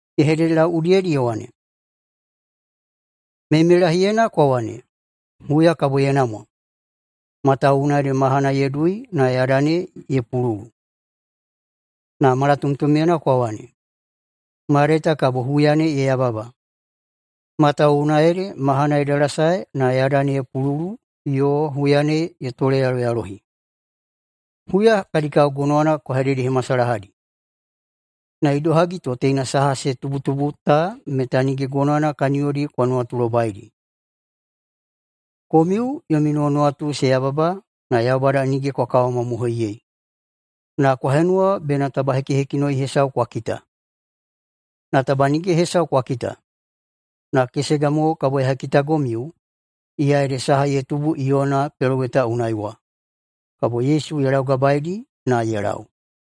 Ye hededelau udiyedi ye wane, “Meimeilahiyena kwa wane, ‘Huya kabo ye namwa, matawuwuna ede mahana ye dui na yada ne ye pululu.’ Na malatomtomyena kwa wane, ‘Mayadai ta kabo huya ne ye yababa, matawuwuna ede mahana ye dalasae na yada ne ye pululu yo huya ne ye toleyaloyalohi.’ Huya kadi kao gonowana kwa hededehemasalahadi, na idohagi to teina saha se tubutubu ta meta nige gonowana kaniyodi kwa nuwatulobaidi. Komiu yomi nuwanuwatu se yababa na Yaubada nige kwa kawamamohoiyei, na kwa henuwa bena taba hekihekinoi hesau kwa kita. Na taba nige hesau kwa kita, na kesega mo kabo ya hekitagomiu, iya ede saha ye tubu Iyona peloweta unai wa.” Kabo Yesu ye laugabaeidi na ye lau.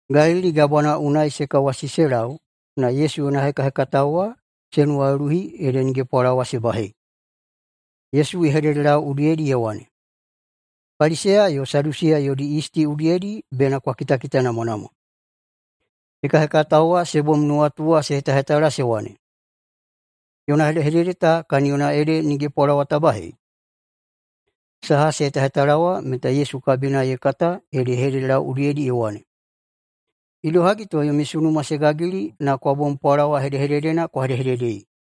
Galili Gabwana unai se kawasi se lau na Yesu yona hekahekatao wa se nuwaluluhi ede nige pwalawa se bahei. Yesu ye hededelau udiyedi ye wane, “Paliseya yo Sadusiya yodi yisti udiyedi bena kwa kitakitanamwanamwa.” Hekahekatao wa se bom nuwatu wa se hetahetala se wane, “Yona hedehedede ta kaniyona ede nige pwalawa ta bahei.” Saha se hetahetala wa meta Yesu kabina ye kata ede ye hededelau udiyedi ye wane, “Idohagi to yomi sunuma se gagili na kwa bom pwalawa hedehededena kwa hedehededei?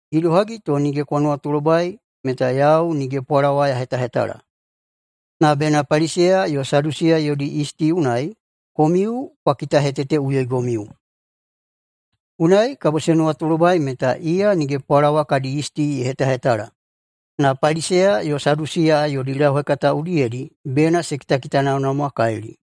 Idohagi to nige kwa nuwatulobai meta yau nige pwalawa ya hetahetala? Na bena Paliseya yo Sadusiya yodi yisti unai komiu kwa kitaheteteꞌuyoigomiu.” Unai kabo se nuwatulobai meta iya nige pwalawa kadi yisti ye hetahetala, na Paliseya yo Sadusiya yodi lauhekata udiyedi bena se kitakitanamwanamwakalili.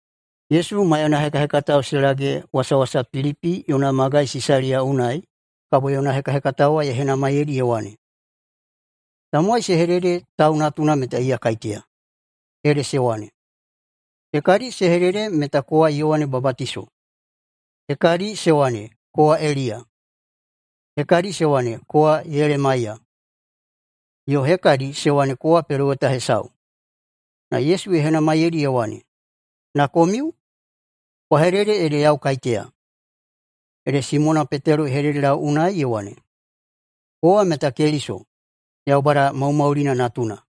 Yesu maiyana hekahekatao se lage wasawasa Pilipi yona magai Sisaliya unai, kabo yona hekahekatao wa ye henamaiyeidi ye wane, “Tamowai se hedede Tau Natuna meta iya kaiteya?” Ede se wane, “Hekadi se hedede meta kowa Yowane Babatiso, hekadi se wane kowa Eliya, hekadi se wane kowa Yelemaiya, yo hekadi se wane kowa peloweta hesau.” Na Yesu ye henamaiyeidi ye wane, “Na komiu? Kwa hedede ede yau kaiteya!” Ede Simona Petelo ye hededelau unai ye wane, “Kowa meta Keliso, Yaubada maumaulina natuna.”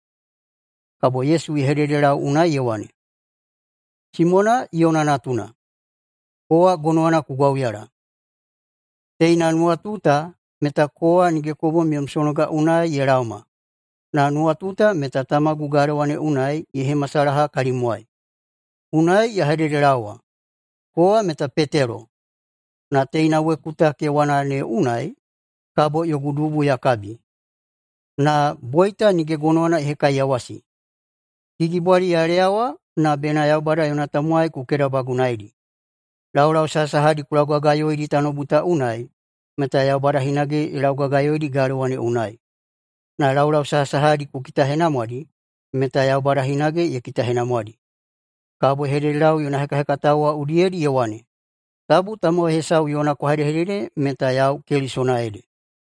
Kabo Yesu ye hededelau unai ye wane, “Simona, Iyona natuna, kowa gonowana ku gwauyala! Teina nuwatu ta meta kowa nige ku bom yom sonoga unai ye laoma, na nuwatu ta meta tamagu galewa ne unai ye hemasalaha kalimwai. Unai ya hededelaowa, kowa meta Petelo, na teina weku ta kewana ne unai kabo yogu dubu ya kabi. Na boita nige gonowana ye hekaiyawasi. Gigibwali ya leyawa na bena Yaubada yona tamowai ku kedabagunaidi. Laulau sahasahadi ku laugagayoidi tanoubu ta unai, meta Yaubada hinage ye laugagayoidi galewa ne unai. Na laulau sahasahadi ku kitahenamwadi, meta Yaubada hinage ye kitahenamwadi.” Kabo ye hededelau yona hekahekatao wa udiyedi ye wane, “Tabu tamowai hesau yona kwa hedehedede meta yau Kelisona ede.”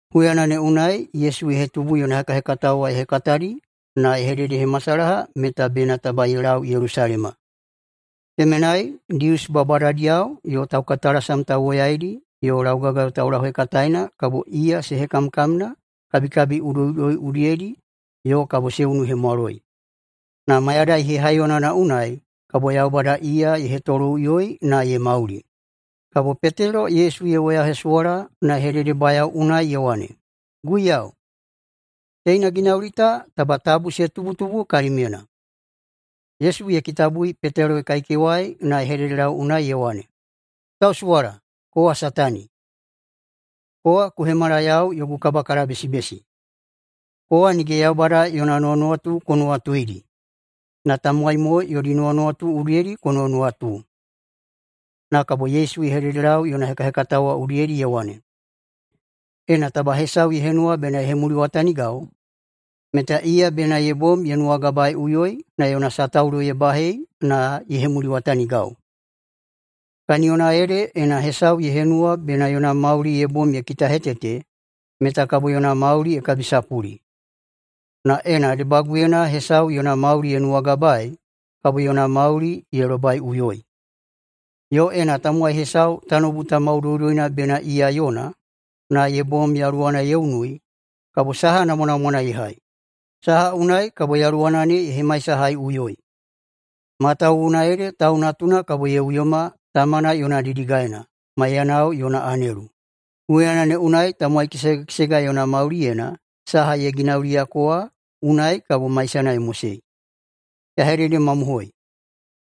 Huyana ne unai Yesu ye hetubu yona hekahekatao ye hekatadi na ye hededehemasalaha meta bena taba ye lau Yelusalema. Temenai Dius babadadiyao yo taukaitalasam tauwoyaidi yo laugagayo taulauhekataena kabo iya se hekamkamna kabikabi udoiꞌudoi udiyedi yo kabo se unuhemwaloi, na mayadai hehaiyonana unai kabo Yaubada iya ye hetoloꞌuyoi na ye mauli. Kabo Petelo Yesu ye woyahesuwala na ye hededebayao unai ye wane, “Guiyau, teina ginauli ta taba tabu se tubutubu kalimyena.” Yesu ye kitabui Petelo ye kaikewai na ye hededelau unai ye wane, “Ku tausuwala, kowa Satani! Kowa ku hemala yau yogu kabakalabesibesi. Kowa nige Yaubada yona nuwanuwatu ku nuwatuidi, na tamowai mo yodi nuwanuwatu udiyedi ku nuwanuwatu.” Na kabo Yesu ye hededelau yona hekahekatao wa udiyedi ye wane, “Ena taba hesau ye henuwa bena ye hemuliwatanigau, meta iya bena ye bom ye nuwagabaeꞌuyoi na yona sataulo ye bahei na ye hemuliwatanigau. Kaniyona ede ena hesau ye henuwa bena yona mauli ye bom ye kitahetete, meta kabo yona mauli ye kabisapuli. Na ena debaguyena hesau yona mauli ye nuwagabaei, kabo yona mauli ye lobaiꞌuyoi. Yo ena tamowai hesau tanoubu ta maudoudoina bena iya yona, na ye bom yaluwana ye unui, kabo saha namwanamwana ye hai? Saha unai kabo yaluwana ne ye hemaisahaiꞌuyoi? Matawuwuna ede Tau Natuna kabo ye uyoma Tamana yona didigaena, maidanao yona anelu. Huyana ne unai tamowai kesega kesega yona mauliyena saha ye ginauliyako wa unai kabo maisana ye mosei. Ya hededemamohoi: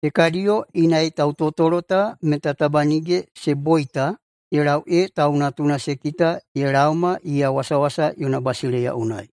Hekadiyo inai tautotolo ta meta taba nige se boita ye lau ee Tau Natuna se kita ye laoma iya wasawasa yona basileiya unai.”